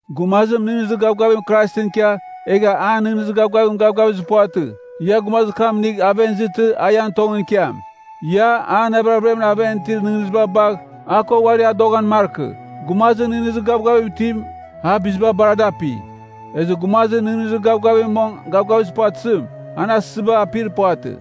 Gumazim nɨghnɨzir gavgavim Kraisɨn ikia, egha an nɨghnɨzir gavgavim gavgavizir puvatɨ, ia gumazir kam inigh aven izɨtɨ a ian tongɨn ikiam. Ia, an navir averiamɨn aven itir nɨghnɨziba bagh, a ko uari adoghan markɨ. Gumazir nɨghnɨzir gavgavim itim, a biziba bar a dapi. Ezɨ gumazir nɨghnɨzir gavgavim mong gavgavizir puvatɨzim, an asɨziba apir puvatɨ.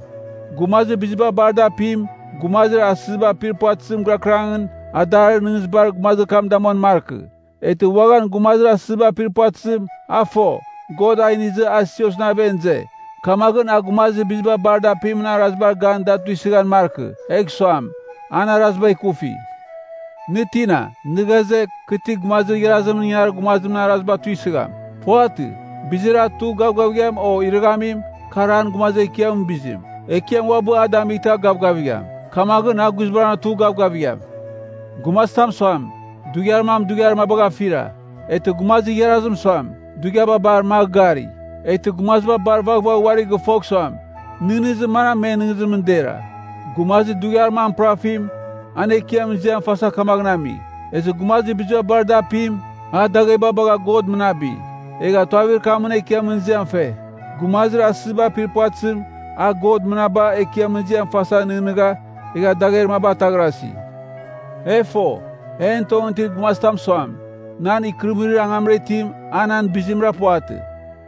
Gumazir biziba bar da apim, gumazir asɨziba apir puvatɨzim girakɨrangɨn adarir nɨghnɨzibar gumazir kam damuan markɨ. Eghtɨ uaghan gumazir asɨziba apir puvatɨzim, a fo, God a inizɨ a siosɨn aven ize, kamaghɨn, a gumazir biziba bar da apimɨn arazibar gan da tuisɨghan markɨ egh suam, an araziba ikufi. Nɨ tina, nɨ ghaze, kɨ ti gumazir igharazimɨn ingangarir gumazimɨn araziba tuisɨgham. Puvatɨ. Bizir a tugh gavgavigham o a irɨghamim, kar an Gumazir Ekiamɨn bizim. Ekiam uabɨ a damightɨ a gavgavigham, kamaghɨn a guizbangɨra tugh gavgavigham. Gumazitam suam, dughiar mam dughiar mabagh afira. Eghtɨ gumazir igharazim suam, dughiaba bar magh gari. Eghtɨ gumaziba bar vaghvagh uari gɨfogh suam, nɨghnɨzir manam men nɨghnɨzimɨn dera. Gumazir dughiar mam pɨrafim, an Ekiamɨn ziam fasa kamaghɨn ami. Ezɨ gumazir biziba bar a da apim, a dagheba bagha God mɨnabi, egha tuavir kamɨn Ekiamɨn ziam fe. Gumazir asɨziba apir puvatɨzim, a God mɨnaba, Ekiamɨn ziam fasa nɨghnɨgha, egha dagher maba ataghrasi. E fo, en tongɨn itir gumazitam suam, nan ikɨrɨmɨrir angamra itim, a nan bizimra puvatɨ.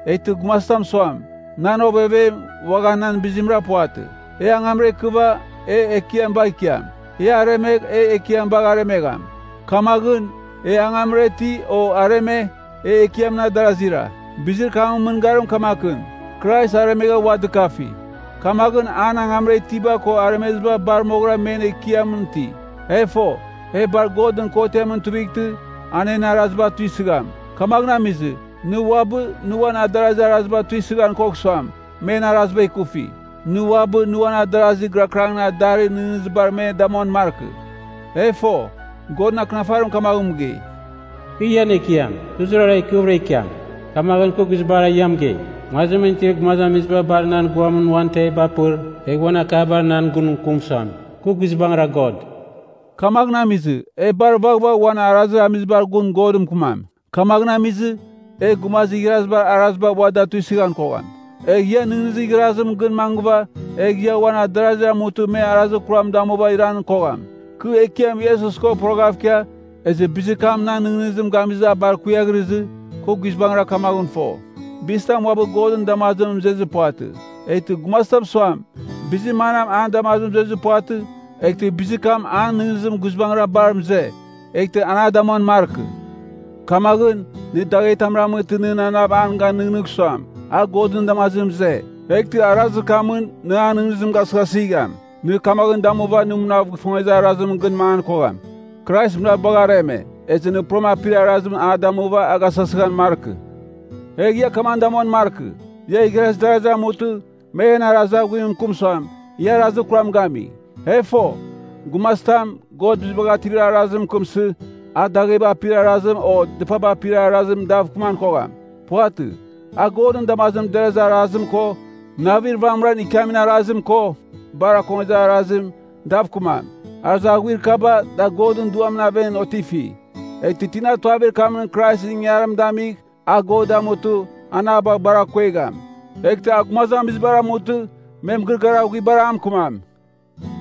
Eghtɨ gumazitam suam, nan ovevem, uaghan nan bizimra puvatɨ. E angamra ikɨva, e Ekiam bagh ikiam. E aremegh, e Ekiam bagh aremegham. Kamaghɨn, e angamra iti, o areme, e Ekiamɨn adarazira. Bizir kamɨn mɨngarim kamakɨn. Krais aremegha ua dɨkafi. Kamaghɨn an angamra itiba ko aremeziba bar moghɨra men Ekiamɨn iti. E fo, e bar Godɨn kotiamɨn tuivightɨ, an en araziba tuisɨgham. Kamaghɨn amizɨ, nɨ uabɨ, nɨ uan adarazir araziba tuisɨghan kogh suam, men araziba ikufi. Nɨ uabɨ, nɨ uan adarazir gɨrakɨrangɨn adarir nɨghnɨzibar me damuan markɨ. E fo, Godɨn Akɨnafarim kamaghɨn mɨgei, “Kɨ ian Ekiam, kɨ zurara ikɨvɨra ikiam, kamaghɨn kɨ guizbangɨra ia mɨgei, ‘Nguazimɨn itir gumazamiziba bar nan guamɨn uan teviba apɨr, egh uan akabar nan gun mɨkɨm suam, kɨ guizbangɨra God.’” Kamaghɨn amizɨ, e bar vaghvagh uan arazir amizibar gun Godɨn mɨkɨmam. Kamaghɨn amizɨ, e gumazir igharazibar araziba ua da tuisɨghan kogham. Egha ia nɨghnɨzir igharazimɨn gɨn mangɨva, egh e uan adarazir amutɨ me arazir kuram damuva iran kogham. Kɨ Ekiam Iesus ko poroghav ikia, ezɨ bizir kam nan nɨghnɨzim gamizɨ a bar kuiaghrɨzɨ, kɨ guizbangɨra kamaghɨn fo, bizitam uabɨ Godɨn damazimɨn mɨzezir puvatɨ. Eghtɨ gumazitam suam, bizir manam an damazimɨn zuezir puvatɨ, eghtɨ bizir kam an nɨghnɨzimɨn guizbangɨra bar mɨze, eghtɨ an a damuan markɨ. Kamaghɨn, nɨ daghetam ramɨtɨ, nɨn anav gan nɨghnɨgh suam, a Godɨn damazimɨn mɨze, eghtɨ arazir kamɨn nɨ an nɨghnɨzim gasɨghasɨgham. Nɨ kamaghɨn damuva nɨ munav gifongezir arazimɨn gɨn mangan kogham. Krais munav bagha areme, ezɨ nɨ puram apir arazim a damuva a gasɨghasɨghan markɨ. Egh ia kamaghɨn damuan markɨ, ia igharaz darazir amutɨ, me ian arazir aghuim mɨkɨm suam, ia arazir kuram gami. E fo, gumazitam, God Bizibagh Ativir Arazim mɨkɨmsɨ, a dagheba apir araziba o dɨpaba apir araziba dav kɨman kogham. Puvatɨ. A Godɨn damazimɨn derazir arazim ko, navir vamɨran ikiamin arazim ko, bar akongezir arazim, dav kɨmam. Arazir aghuir kaba, da Godɨn Duamɨn aven otifi. Eghtɨ tina tuavir kamɨn Kraisɨn ingangarim damigh, a God damutɨ, an a bagh bar akuegham. Eghtɨ a gumazamizibar amutɨ, me mɨgɨrɨgɨar aghuibar a mɨkɨmam.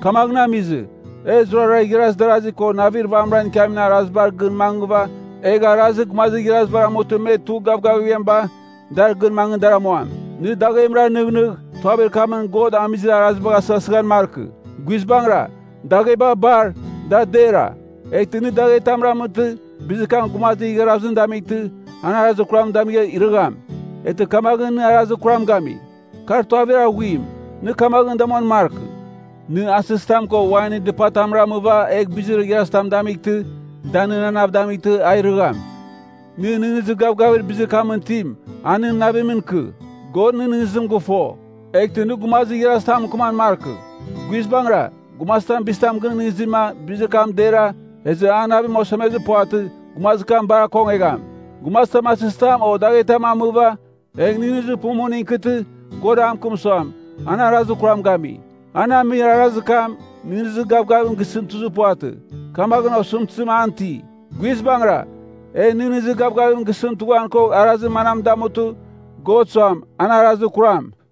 Kamaghɨn amizɨ, e zurara igharaz darasi ko navir vamɨra ikiamin arazibar gɨn mangɨva, egh arazir gumazir igharazibar amutɨ me tugh gavgavighamiba, dar gɨn mangɨ dar amuam. Nɨ daghemra nɨghnɨgh, tuavir kamɨn God amizir arazibagh asɨghasɨghan markɨ. Guizbangɨra, dagheba bar, da dera. Eghtɨ nɨ daghetam ramɨtɨ, bizir kam gumazir igharazim damightɨ, an arazir kuram damigh irɨgham, eghtɨ kamaghɨn nɨ arazir kuram gami. Kar tuavir aghuim, nɨ kamaghɨn damuan markɨ: nɨ asɨzitam ko wainɨn dɨpatam ramɨva egh bizir igharazitam damightɨ, da nɨn anav damightɨ a irɨgham. Nɨ nɨghnɨzir gavgavir bizir kamɨn itim, a nɨn navimɨn ikɨ. God nɨn nɨghnɨzim gɨfo, eghtɨ nɨ gumazir igharazitamɨn mɨkɨman markɨ. Guizbangɨra, gumazitam bizitam gɨnɨghnɨzima, bizir kam dera, ezɨ an navim osemezir puvatɨ, gumazir kam bar akongegham. Gumazitam asizitam o daghetam amɨva, egh nɨghnɨzir pumuning ikɨtɨ God a mɨkɨm suam, an arazir kuram gami. An amir arazir kam, nɨghnɨzir gavgavim gisɨn tuzir puvatɨ, kamaghɨn osɨmtɨzim an iti. Guizbangɨra, e nɨghnɨzir gavgavim gisɨn tughan kogh arazir manam damutɨ, God suam, an arazir kuram.